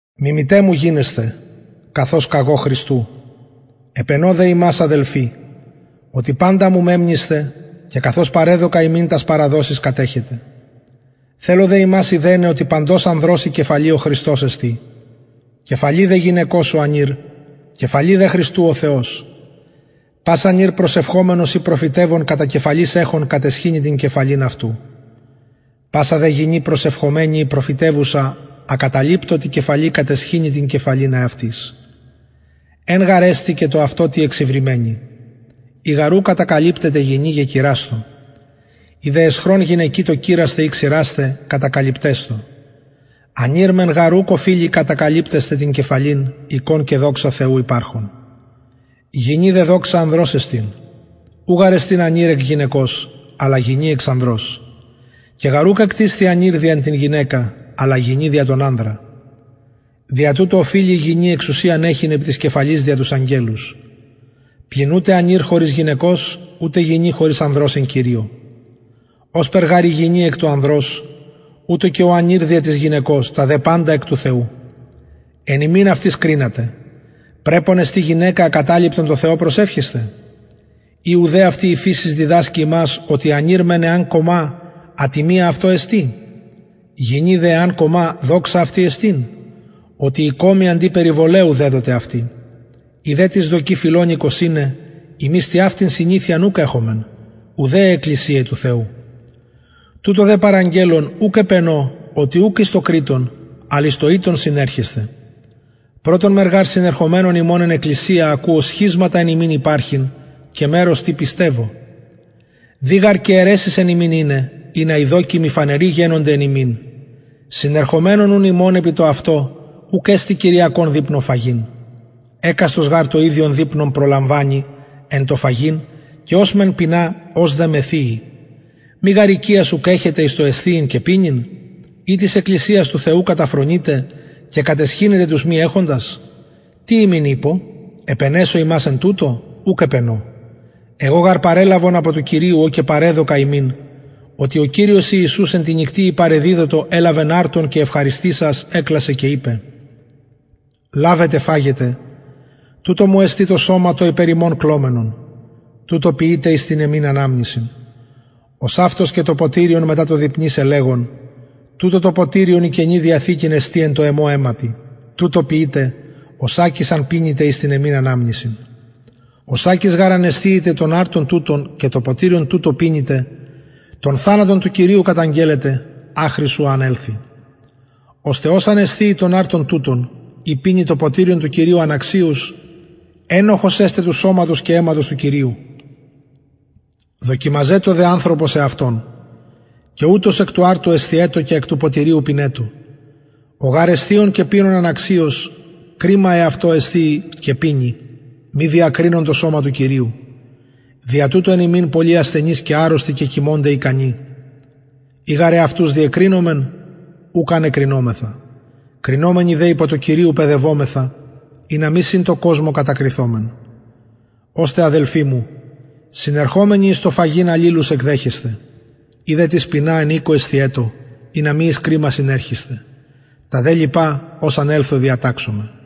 μιμηται μου γινεσθε καθως καγω χριστου επαινω δε υμας αδελφοι οτι παντα μου μεμνησθε και καθως παρεδωκα υμιν τας παραδοσεις κατεχετε θελω δε υμας ειδεναι οτι παντος ανδρος η κεφαλη ο χριστος εστιν κεφαλη δε γυναικος ο ανηρ κεφαλη δε χριστου ο θεος πας ανηρ προσευχομενος η προφητευων κατα κεφαλης εχων καταισχυνει την κεφαλην αυτου πασα δε γυνη προσευχομενη η προφητευουσα ακατακαλυπτω τη κεφαλη καταισχυνει την κεφαλην εαυτης εν γαρ εστιν και το αυτο τη εξυρημενη ει γαρ ου κατακαλυπτεται γυνη και κειρασθω ει δε αισχρον γυναικι το κειρασθαι η ξυρασθαι κατακαλυπτεσθω ανηρ μεν γαρ ουκ οφειλει κατακαλυπτεσθαι την κεφαλην εικων και δοξα θεου υπαρχων γυνη δε δοξα ανδρος εστιν ου γαρ εστιν ανηρ εκ γυναικος αλλα γυνη εξ ανδρος και γαρ ουκ εκτισθη ανηρ δια την γυναικα αλλα γυνη δια τον ανδρα δια τουτο οφειλει η γυνη εξουσιαν εχειν επι της κεφαλης δια τους αγγελους πλην ουτε ανηρ χωρις γυναικος ουτε γυνη χωρις ανδρος εν κυριω ωσπερ γαρ η γυνη εκ του ανδρος ουτως και ο ανηρ δια της γυναικος τα δε παντα εκ του θεου εν υμιν αυτοις κρινατε πρεπον εστιν γυναικα ακατακαλυπτον τω θεω προσευχεσθαι η ουδε αυτη η φυσις διδασκει υμας οτι ανηρ μεν εαν κομα ατιμια αυτω εστιν γυνη δε εαν κομα δοξα αυτη εστιν οτι η κομη αντι περιβολαιου δεδοται ει δε τις δοκει φιλονεικος ειναι ημεις τοιαυτην συνηθειαν ουκ εχομεν ουδε αι εκκλησιαι του θεου τουτο δε παραγγελλων ουκ επαινω οτι ουκ εις το κρειττον αλλ εις το ηττον συνερχεσθε πρωτον μεν γαρ συνερχομενων υμων εν εκκλησια ακουω σχισματα εν υμιν υπαρχειν και μερος τι πιστευω δει γαρ και αιρεσεις εν υμιν ειναι ινα οι δοκιμοι φανεροι γενωνται εν υμιν συνερχομενων ουν υμων επι το αυτο ουκ εστιν κυριακον δειπνον φαγειν εκαστος γαρ το ιδιον δειπνον προλαμβανει εν τω φαγειν και ος μεν πεινα ος δε μεθυει μη γαρ οικιας ουκ εχετε εις το εσθιειν και πινειν η της εκκλησιας του θεου καταφρονειτε και καταισχυνετε τους μη εχοντας τι υμιν ειπω επαινεσω υμας εν τουτω ουκ επαινω εγω γαρ παρελαβον απο του κυριου ο και παρεδωκα υμιν οτι ο κυριος ιησους εν τη νυκτι η παρεδιδοτο ελαβεν αρτον και ευχαριστησας εκλασεν και ειπεν λαβετε φαγετε τουτο μου εστιν το σωμα το υπερ υμων κλωμενον τουτο ποιειτε εις την εμην αναμνησιν ωσαυτως και το ποτηριον μετα το δειπνησαι λεγων τουτο το ποτηριον η καινη διαθηκη εστιν εν τω εμω αιματι τουτο ποιειτε οσακις αν πινητε εις την εμην αναμνησιν οσακις γαρ αν εσθιητε τον αρτον τουτον και το ποτηριον τουτο πινητε τον θανατον του κυριου καταγγελλετε αχρι ου αν ελθη ωστε ος αν εσθιη τον αρτον τουτον η πινη το ποτηριον του κυριου αναξιως του κυριου ενοχος εσται του σωματος και του αιματος του κυριου δοκιμαζετω δε ανθρωπος εαυτον και ουτως εκ του αρτου εσθιετω και εκ του ποτηριου πινετω ο γαρ εσθιων και πινων αναξιως κριμα εαυτω εσθιει και πινει μη διακρινων το σωμα του κυριου δια τουτο εν υμιν πολλοι ασθενεις και αρρωστοι και κοιμωνται ικανοι ει γαρ εαυτους διεκρινομεν ουκ αν εκρινομεθα κρινομενοι δε υπο κυριου παιδευομεθα ινα μη συν τω κοσμω κατακριθωμεν ωστε αδελφοι μου συνερχομενοι εις το φαγειν αλληλους εκδεχεσθε ει δε τις πεινα εν οικω εσθιετω ινα μη εις κριμα συνερχησθε τα δε λοιπα ως αν ελθω διαταξομαι